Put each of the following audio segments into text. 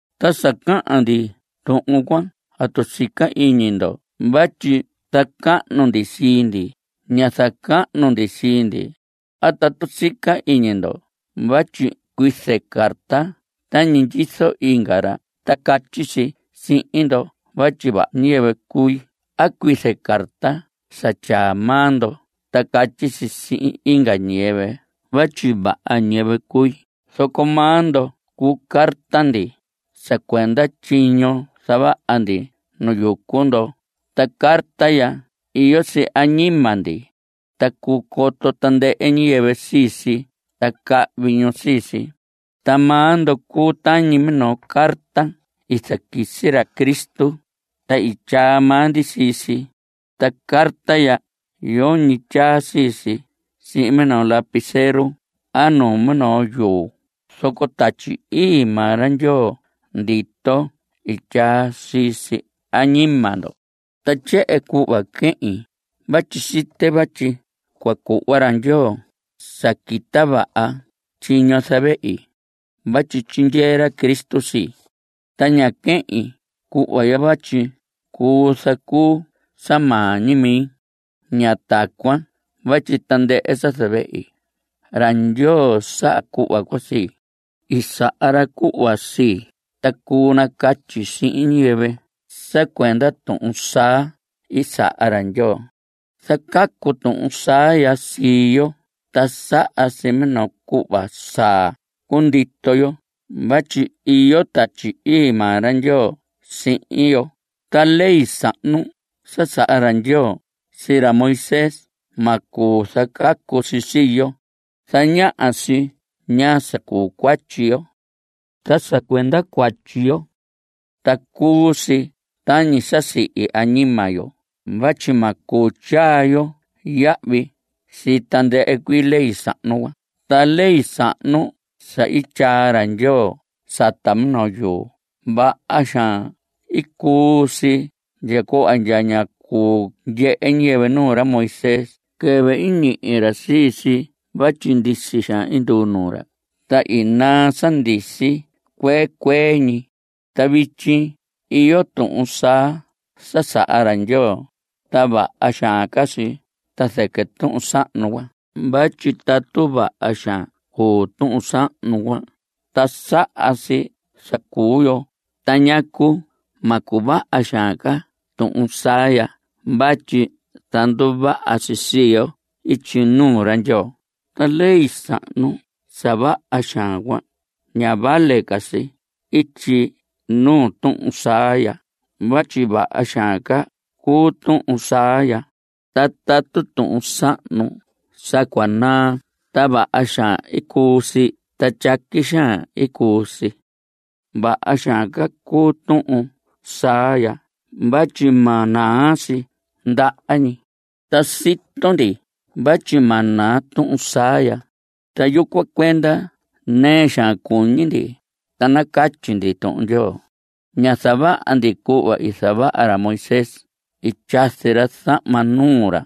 Ta sa cahan ndi tuhun cuan ¿atu sica iñi ndo vatyi zacahnu ndi sii ndi? Ña zacahnu ndi sii ndi. ¿A atu sica iñi ndo vatyi cuize carta tañi ndyizo inga ra ta catyi si sihin ndo vatyi vaha ñiyɨvɨ cui a cuize carta sa tyaa maa ndo ta catyi si sihin inga ñiyɨvɨ vatyi vaha ñiyɨvɨ cui? Zoco maa ndo cuu carta ndi. (Sa cuenda tyiño i zavaha ndi nu yucu ndo.) Ta carta ya iyo si añima ndi. Ta cuu coto tandɨhɨ ñiyɨvɨ sii si ta cahvi ñu sii si. Ta maa ndo cuu tañi minoo carta i zaquisi ra Cristo, ta i tyaa maa ndi sii si. Ta carta ya yoñi tyaa sii si sihin minoo lapicero a nu minoo yuu, zoco Tatyi Ii maa ra Ndyoo ndito i tyaa si sisi añima ndo. Ta tyehen cuhva quehin vatyi site vatyi cua cuhva ra Ndyoo sa quita vaha tyiño zavehi. Vatyi tyindyee ra Cristo sii. Ta ña quehin cuhva ya vatyi cuu zacuu sa maa ñi mi. Ña tacuan, vatyi tandɨhɨ sa zavehi, ra Ndyoo saha cuhva cuan sii. I saha ra cuhva sii, ta cuu nacatyi sihin ñiyɨvɨ sa cuenda tuhun saa i saha ra Ndyoo. Zacacu tuhun saa ya sii yo, ta saha si minoo cuhva saa, cundito yo vatyi iyo Tatyi Ii maa ra Ndyoo sihin yo. Ta ley sahnu sa saha ra Ndyoo sii ra Moisés, ma cuu zacacu si sii yo. Zañaha si ñaa sa cuu cuatyi yo. Ta sa cuenda cuatyi yo, ta cuu si tañi sa sihi añima yo vatyi ma cuu tyaa yo yahvi sii tandɨhɨ cuii ley sahnu cuan. Ta ley sahnu sa i tyaa ra Ndyoo sata minoo yuu, vaha xaan i cuu si ndya cuhva ndya ñá cuu ndyehe ñiyɨvɨ nuu ra Moisés quɨvɨ i ñihi ra sii si vatyi ndisi xaan i nduu nuu ra. Ta i naa sa ndisi cuan cuee cuee ñi. Ta vityi iyo tuhun saa sa saha ra Ndyoo, ta vaha xaan ca si ta zɨquɨ tuhun sahnu cuan. Vatyi tatu vaha xaan cuu tuhun sahnu cuan ta saha si sa cuu yo ¿ta ñacu ma cuvaha xaan ca tuhun saa ya vatyi zanduvaha si sii yo ityi nuu ra Ndyoo? Ta ley sahnu sa vaha xaan cuan, ña vale ca si ityi nuu tuhun saa ya vatyi vaha xaan ca cuu tuhun saa ya. Ta tatu tuhun sahnu sa cua naa ta vaha xaan i cuu si ta tyaqui xaan i cuu si, vaha xaan ca cuu tuhun saa ya vatyi ma naa si ndaha ñi. Ta sito ndi vatyi ma naa tuhun saa ya, ta yucuan cuenda nɨɨ xaan cuñi ndi ta nacatyi ndi Tuhun Ndyoo. Ña zavaha ndi cuhva i zavaha ra Moisés. I tyazi ra zahma nuu ra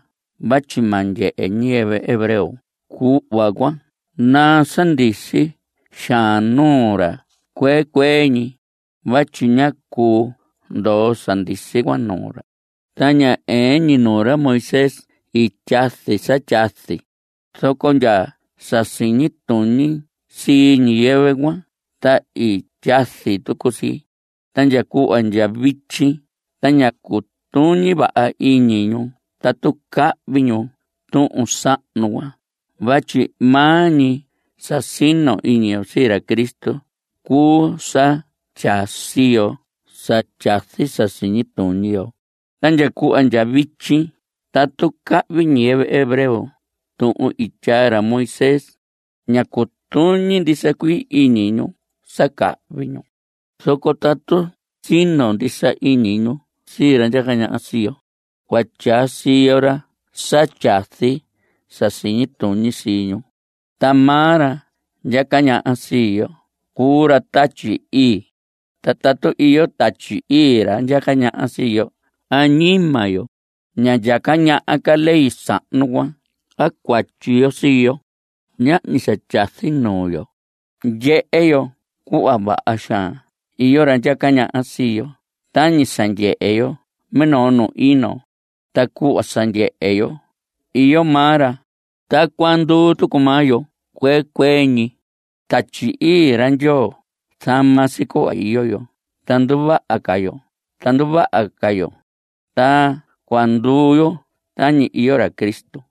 vatyi ma ndyehe ñiyɨvɨ hebreo cuhva cua naa sa ndisi xaan nuu ra cuee cuee ñi. Vatyi ñá cuu ndoo sa ndisi cuan nuu ra. Ta ña ɨɨn ñi nuu ra Moisés i tyazi sa tyazi, zoco ndya sa siñi tuñi sii ñiyɨvɨ cuan ta i tyazi tucu si. Ta ndya cuhva ndya vityi ta ña cutuñi vaha iñi ñu tatu cahvi ñu tuhun sahnu cuan vatyi maa ñi sa sino iñi yo sii ra Cristo cuu sa tyaa siyo sa tyazi sa siñi tuñi yo. Ta ndya cuhva ndya vityi tatu cahvi ñiyɨvɨ hebreo tuhun i tyaa ra Moisés, ña cutuñi ndisa cuii iñi ñu sa cahvi ñu. Zoco tatu sino ndisa iñi ñu sii ra ndyaca ñaha sii yo, cua tyaa siyo ra sa tyazi sa siñi tuñi sii ñu. Ta maa ra ndyaca ñaha sii yo cuu ra Tatyi Ii. Ta tatu iyo Tatyi Ii ra ndyaca ñaha sii yo añima yo, ña ndyaca ñaha ca ley sahnu cuan a cuatyi yo sii yo. Ñahñi sa tyazi nuu yo. Ndyehe yo cuhva vaha xaan iyo ra ndyaca ñaha sii yo tañi sa ndyehe yo minoo nu ino. Ta cuhva sa ndyehe yo iyo maa ra, tacuan nduu tucu maa yo cuee cuee ñi. Tatyi Ii ra Ndyoo zama si cuhva iyo yo ta nduvaha ca yo ta nduvaha ca yo, ta cuahan nduu yo tañi iyo ra Cristo.